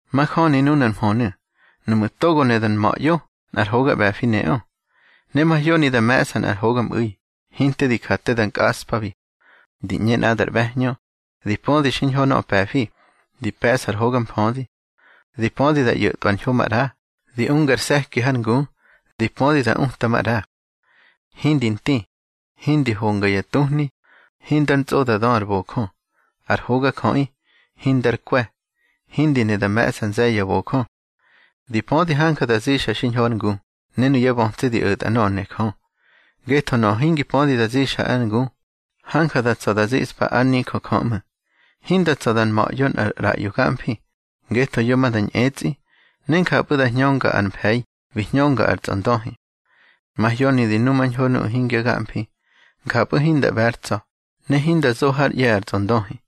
Majöni nunar mhönu̱: Nuꞌmu̱ togo ne da nma̱ꞌyo, nꞌar hoga ꞌbe̱fi neꞌö. Ne mahyoni da me̱ꞌsa nꞌar hogamꞌu̱i, hinte di ja te da nkꞌaꞌspabi. Di ꞌñe nꞌadar ꞌbe̱hñö, di pödi xiñho nöꞌö pe̱fi, di pe̱ꞌsa ar hoga mfödi. Di pödi da ꞌyo̱tꞌwa ar ñho maꞌra, di ungar se̱ki hár ngu, ne di pödi da uta maꞌra. Hindi nti, hindi honga ya tuhni, hindar ntsꞌo da dö ar bojö. Ar hogajöꞌi, hindar kwe̱, hindi ne da me̱ꞌsa nze̱ye̱ ya bojö. Di pödi hanja da zixa xiñho ár ngu, ne nuyá bötsi di o̱tꞌa nöꞌö ne Jö. Ngetho nöꞌö hingi pödi da zixa ár ngu, hanja da tsa̱ da ziꞌspa ár nijö Jö ꞌmu̱. Hinda tsa̱ da nma̱ꞌyo nꞌar ꞌraꞌyo gamfi, ngetho yo ma da ñꞌetsꞌi, ne njapꞌu̱ da hñönga ar mfe̱i bi hñönga ar tsꞌondöhi. Mahyoni di numañho nuꞌu̱ hingya gamfi. Njapꞌu̱ hinda ꞌbe̱ ár tsa̱, ne hinda zo hár ꞌye̱ ar tsꞌondöhi.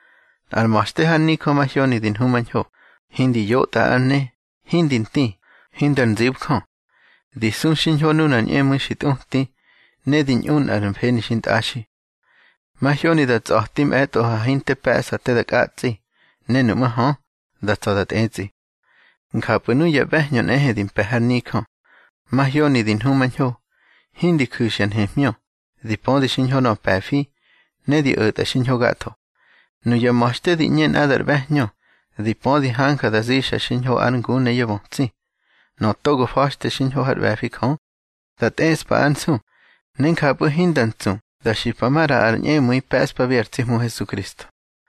Nꞌar ma̱xte har nijö mahyoni di nhumañho, hindi yotꞌa ár ne, hindi nti, hindar nzibjö. Di su xiñho nuna ñꞌemu̱i xi tꞌuti, ne di ñꞌu nꞌar mfeni xintꞌaxi. Mahyoni da ntsꞌa̱ti mꞌe̱tꞌo ha hinte pe̱ꞌsa te da kꞌatsꞌi, ne nuꞌmú̱ hö, da tsa̱ da tꞌetsꞌi. Njapꞌu̱ nuya ꞌbe̱hñö nꞌehe di mpe̱ har nijö, mahyoni di nhumañho, hindi ju̱xya nhemhñö, di pödi xiñho nöꞌö pe̱fi, ne di o̱tꞌa xiñho gatho. Nuya ma̱xte di ꞌñe nꞌadar ꞌbe̱hñö, di pödi hanja da zixa xiñho ár ngu ne yá bötsi. Nöꞌö togo fa̱xte xiñho hár ꞌbe̱fi Jö, dá tꞌeꞌspa ár nsu, ne njapꞌu̱ hinda ntsu da xipa maꞌra ar ñꞌemu̱i pe̱ꞌspabi ar tsi Hmu Hesukristo.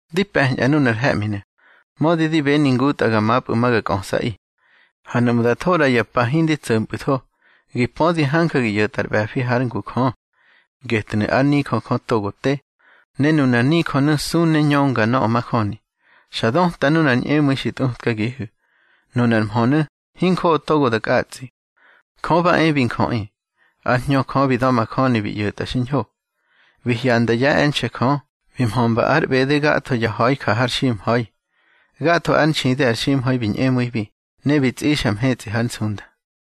Di pe̱ñꞌa nunar he̱ꞌminu̱, mödi di beni ngutꞌa ga mapꞌu̱ ma ga kꞌösꞌaꞌi. Ha nuꞌmu̱ da tho ꞌra ya pa hindi tso̱mpꞌu̱tho, gi pödi hanja gi ꞌyo̱tꞌa ar ꞌbe̱fi hár ngu Jö. Getnu̱ ár nijö Jö togo te, ne nunar nijönu̱ su ne ñönga nöꞌö majöni. Xa döta nunar ñꞌemu̱i xi tꞌutkagihu̱. Nunar mhönu̱ hinjoꞌo togo da kꞌatsꞌi: Jö ba e bi njöꞌi. Ár Hñö Jö bi da̱majöni bi ꞌyo̱tꞌa xiñho. Bi hyanda yá e̱nxe̱ Jö. Bi mhömba ár ꞌbede gatho ya ha̱i ja har ximha̱i. Gatho ár nxidi ar ximha̱i bi ñꞌemu̱ibi ne bi tsꞌixa mhetsꞌi hár nsunda.